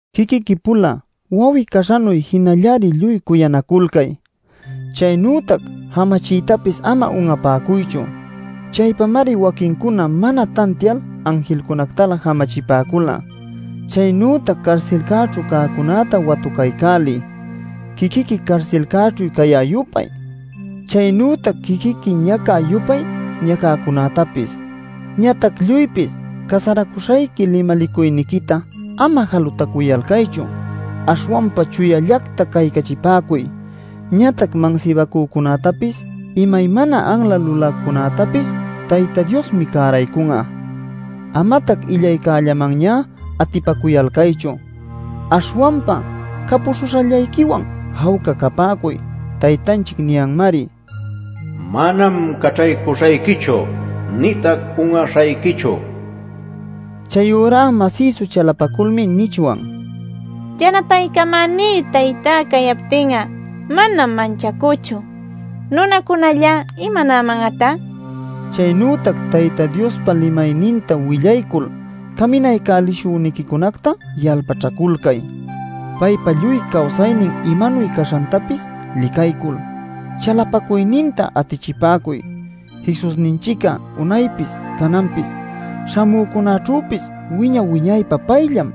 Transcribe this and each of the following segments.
Quiquiqui-pula wawi-caśhanuy jinallari lluy cuyanaculcay. Chaynütac jamachiytapis ama un'apäcuychu; chaypamari waquincuna mana tantial anjilcunactalä jamachipäcula. Chaynütac carsilcäćhu cäcunäta watucaycäliy, quiquiqui carsilcäćhu cayä-yupay, chaynütac quiquiqui ñacä-yupay ñacäcunätapis. Ñatac lluypis casaracuśhayqui limalicuyniquita ama jalutacuyalcaychu. Aśhwanpa chuyallacta caycachipäcuy. Ñatac mansibacücunätapis imaymana anla luläcunätapis Tayta Diosmi cäraycun'a. Amatac illaycällamanñá atipacuyalcaychu; aśhwanpa capuśhuśhayquillawan jawca capäcuy; Taytanchic niyanmari: “Manam caćhaycuśhayquichu nïtac un'aśhayquichu” nil. Chayurá masïsu chalapaculmi nichwan: “Yanapaycamäní Taytá cayaptin'a manam manchacüchu. ¿Nunacunalla imanäman'atá?” nil. Chaynütac Tayta Diospa limayninta willaycul caminaycälishüniquicunacta yalpaćhaculcay. Paypa lluy cawsaynin imanuy caśhantapis licaycul, chalapacuyninta atichipäcuy. Jesusninchic'a unaypis cananpis śhamücunäćhüpis wiña-wiñaypä payllam.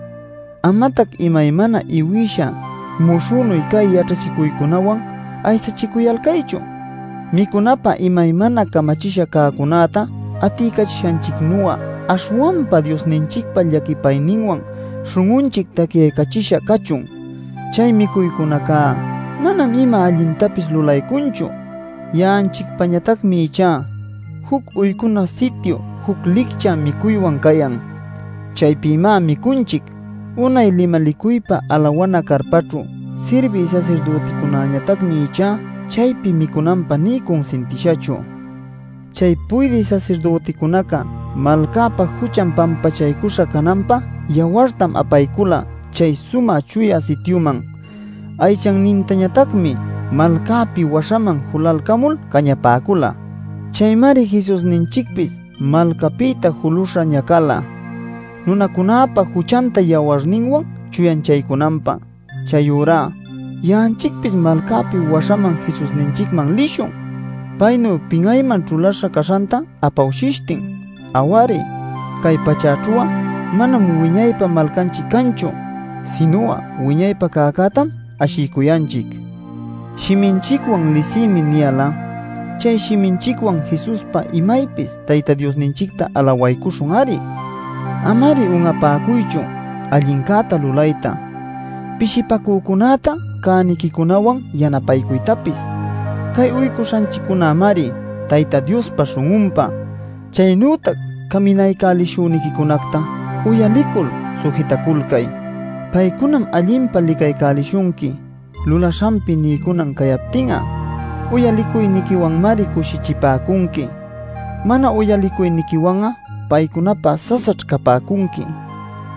Amatac imaymana iwïsha muśhünuy cä yaćhachicuycunäwan aysachicuyalcaychu. Micunapä imaymana camachisha cäcunäta atiycachishanchicnu'a, aśhwanpa Diosninchicpa llaquipayninwan śhun'unchic tacyaycachisha cachun. Chay micuycunacá manam ima allintapis lulaycunchu. Ya'anchicpañatacmi ichá juc uycuna sityu juc licchä micuywan cayan; chaypïmá micunchic. Unay limalicuypa alawana carpaćhu sirbï sasirdüticunäñatacmi ichá chaypi micunanpä nï cunsintishachu. Chay puydï sasirdüticunaca malcäpa juchan pampachaycuśha cananpä yawartam apaycula chay Sumä Chuya Sityuman. Aychannintañatacmi malcapi waśhaman julalcamul cañapäcula. Chaymari Jesusninchicpis malcapïta julüśha ñacala, nunacunäpa juchanta yawarninwan chuyanchaycunanpä. Chayurá ya'anchicpis malcapi waśhaman Jesusninchicman lishun paynuy pin'ayman ćhulaśha caśhanta apawshishtin. Aw-ari, cay pachäćhu'a manam wiñaypä malcanchic canchu, sinu'a wiñaypä cäcätam ashiycuyanchic. Shiminchicwan “lisïmi” niyal'a chay shiminchicwan Jesuspa imaypis Tayta Diosninchicta alawaycuśhun-ari Ama-ari un'apäcuychu allincäta lulayta, pishipacücunäta cäniquicunawan yanapaycuytapis. Cay uycuśhanchiccunämari Tayta Diospa śhun'unpä. Chaynütac caminaycälishüniquicunacta uyalicul sujitaculcay. Paycunam allinpa licaycälishunqui lulaśhanpi niycunan cayaptin'a. Uyalicuyniquiwanmari cushichipäcunqui; mana uyalicuyniquiwan'a paycunapä sasaćh capäcunqui.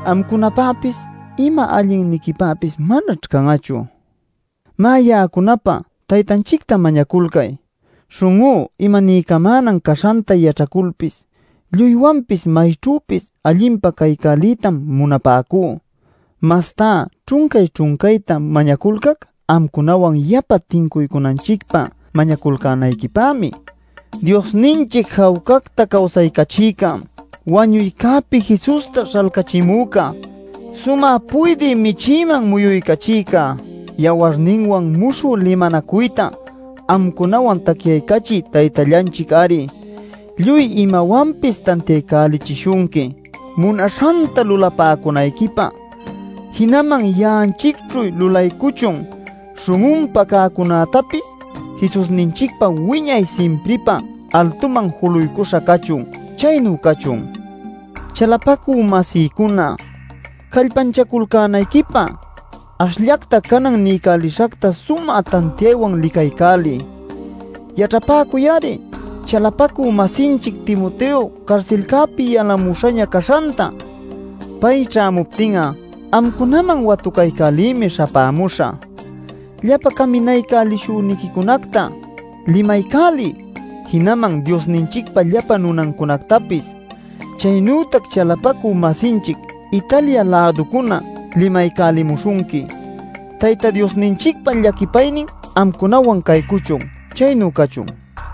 Amcunapäpis ima allinniquipäpis manaćh can'achu. Má, ya'acunapä Taytanchicta mañaculcay; śhun'ú imaniycamänan caśhanta yaćhaculpis lluywanpis mayćhüpis allinpa caycäliytam munapäcú. Mastá ćhuncay-ćhuncayta mañaculcac amcunawan yapa tincuycunanchicpä mañaculcänayquipämi. Diosninchic jawcacta cawsaycachïca, wañuycäpi Jesusta śhalcachimüca, sumä puydï Michïman muyuycachïca, yawarninwan muśhü limanacuyta amcunawan tacyaycachï Taytallanchic-ari, lluy imawanpis tantiaycälichishunqui munaśhanta lulapäcunayquipä, jinaman ya'anchicćhu lulaycuchun śhun'unpä cäcunätapis. Jesusninchicpa wiñay simpripä altuman juluycuśha cachun. Chaynu cachun. Chalapacü-masïcuna, callpanchaculcänayquipä ashllacta canan niycälishacta sumä tantiaywan licaycäliy. Yaćhapäcuy-ari chalapacü-masinchic Timoteo carsilcäpi yalämuśhaña caśhanta. Pay ćhämuptin'a amcunaman watucaycälïmi śhapämuśhä. Llapa caminaycälishüniquicunacta limaycäliy, jinaman Diosninchicpa llapa nunancunactapis. Chaynütac chalapacü-masinchic Italia-läducuna limaycälimuśhunqui. Tayta Diosninchicpa llaquipaynin amcunawan caycuchun. Chaynu cachun.